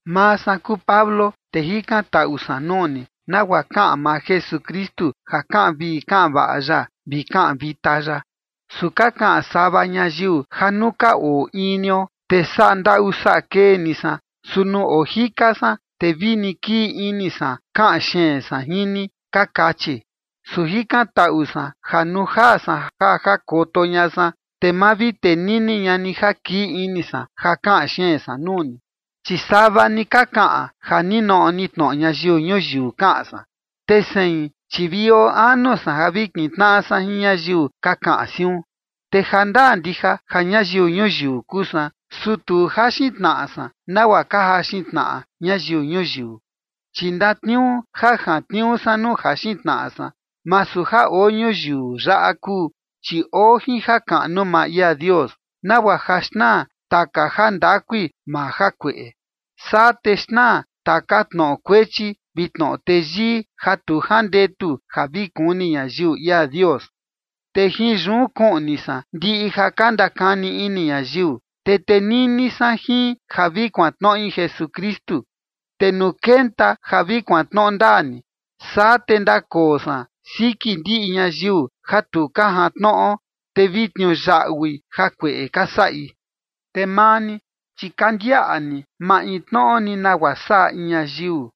Maa san kuu Pablo, te jikantaꞌu san nuu ni nagua kaꞌan maa Jesukristu ja kaꞌan vii kaꞌan vaꞌa ya vi kaꞌan vita ya. Su ka kaꞌan sava ñayiu ja nuu ka oo in nio, te saꞌa ndaꞌu saꞌa kee ni san, su nuu ojika san, te vini kii ini san kaꞌan xeen san jin ni, ka kachi. Su jikantaꞌu san ja nuu jaa san ja jakoto ña san, te ma vi tenini ña ni ja kii ini san ja kaꞌan xeen san nuu ni, chi sava ni ka kaꞌan ja ninoꞌo ni tnoꞌo ñayiu ñuyiu kaꞌan san, te sein chi vi oo anu san ja vi kintnaꞌa san jin ñayiu ka kaꞌan siun. Te jandaa ndija ja ñayiu ñuyiu kuu san, su tu jaxin tnaꞌa san nagua ka jaxin tnaꞌa ñayiu ñuyiu. Chi ndatniuu ja jantniuu san nuu jaxin tnaꞌa san, masu ja oo ñuyiu yaꞌa kuu, chi oo jin jakaꞌnu maa ia Dios, nagua ja xnaa taka jandakui maa jakueꞌe. Saa te xnaa taka tnoꞌo kuechi vi tnoꞌo teyii ja tu jandetu ja vi kuni ñayiu ia Dios. Te jin yun kuꞌni san ndiꞌi ja ka ndakani ini ñayiu, te tenini san jin ja vi kuantnoꞌi Jesukristu. Te nuu kenta ja vi kuantnoꞌo ndaa ni, saa te ndakoo san siki ndiꞌi ñayiu ja tu ka jantnoꞌo, te vi tniuyaꞌui jakueꞌe ka saꞌi. Te maa ni, chi ka ndiaꞌa ni maintnoꞌo ni nagua saꞌa in ñayiu.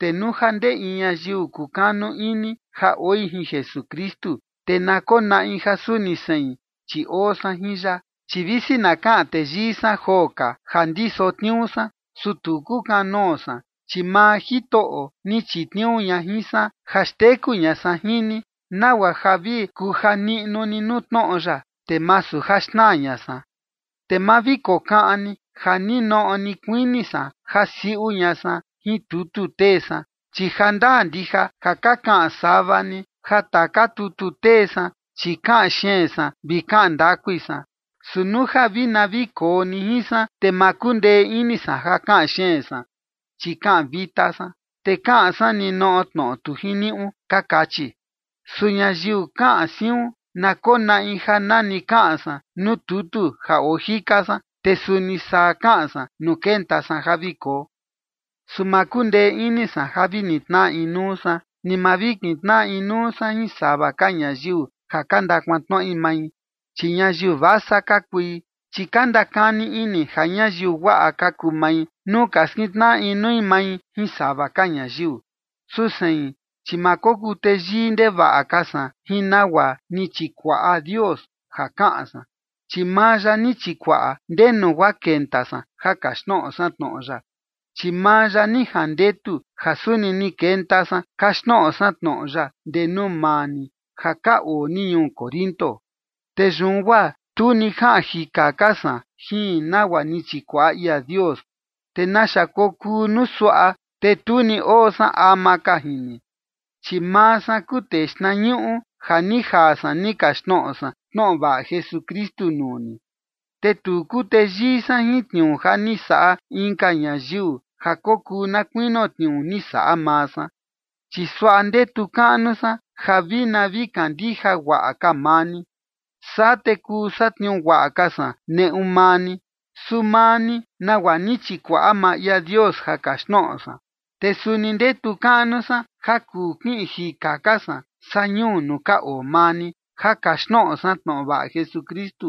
Te nuu ja ndee in ñayiu kukanu ini ja oi jin Jesukristu, te na konaꞌi ja suni sein, chi oo san jin ya. Chi visi na kaꞌan teyii san joo ka ja ndiso tniuu san, su tu kukanoo san, chi maa Jitoꞌo ni chitniuu ña jin san ja xteku ña san jin ni, nagua ja vi kuja niꞌnu ni nuu tnoꞌo ya, te masu ja xnaa ña san. Te ma vi kokaꞌan ni ja ninoꞌo ni kuini san ja siuꞌu ña san jin tutu tee san. Chi jandaa ndija ja ka kaꞌan sava ni ja taka tutu tee san, chi kaꞌan xeen san vi kaꞌan ndakui san, su nuu ja vi na vi koo ni jin san, te ma kundee ini san ja kaꞌan xeen san, chi kaꞌan vita san, te kaꞌan san ninoꞌo tnoꞌo tu jiniuꞌu, ka kachi. Su ñayiu kaꞌan siun, na konaꞌi ja nani kaꞌan san nuu tutu ja oo jika san, te suni saa kaꞌan san nuu kenta san ja vi koo. Su ma kundee ini san ja vi nitnaꞌa inuu san, ni ma vi kintnaꞌa inuu san jin sava ka ñayiu ja ka ndakuantnoꞌi mai. Chi ñayiu vasa ka kui, chi ka ndakani ini ja ñayiu guaꞌa ka kuu mai nuu ka skintnaꞌa inui mai jin sava ka ñayiu. Su sein, chi ma kokuu teyii ndevaꞌa ka san jin nagua ni chikuaꞌa Dios ja kaꞌan san, chi maa ya ni chikuaꞌa ndenu guaa kenta san ja kaxtnoꞌo san tnoꞌo ya, chi maa ya ni jandetu ja suni ni kenta san kaxtnoꞌo san tnoꞌo ya ndee nuu maa ni ja ka oo ni ñuu Corinto. Te yun guaa tu ni jaꞌan jika ka san jin nagua ni chikuaꞌa ia Dios, te naxa kokuu nuu suaꞌa, te tu ni oo san ama ka jin ni, chi maa san kuu tee xtnañuꞌu ja ni jaa san ni kaxtnoꞌo san tnoꞌo vaꞌa Jesukristu nuu ni. Te tu kuu teyii san jin tniuu ja ni saꞌa inka ñayiu, ja kokuu na kuinio tniuu ni saꞌa maa san. Chi suaꞌa ndetu kaꞌnu san ja vi na vi kandija guaꞌa ka maa ni, saa te kuu satniuu guaꞌa ka san neꞌu maa ni, su maa ni nagua ni chikuaꞌa maa ia Dios ja kaxtnoꞌo san. Te suni ndetu kaꞌnu san ja kuu kiꞌin jika ka san saa ñuu nuu ka oo maa ni ja kaxtnoꞌo san tnoꞌo vaꞌa Jesukristu,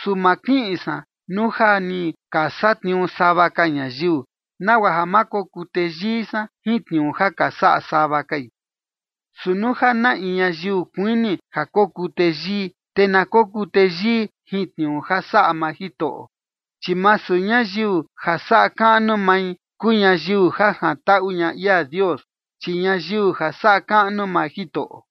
su ma kiꞌin san nuu ja ni ka satniuu sava ka ñayiu, nagua ja ma kokuu teyii san jin tniuu ja ka saꞌa sava kai. Su nuu ja na in ñayiu kuini ja kokuu teyii, te na kokuu teyii jin tniuu ja saꞌa maa Jitoꞌo. Chi masu ñayiu ja saꞌa kaꞌnu mai kuu ñayiu ja jantaꞌu ña ia Dios, chi ñayiu ja saꞌa kaꞌnu maa Jitoꞌo.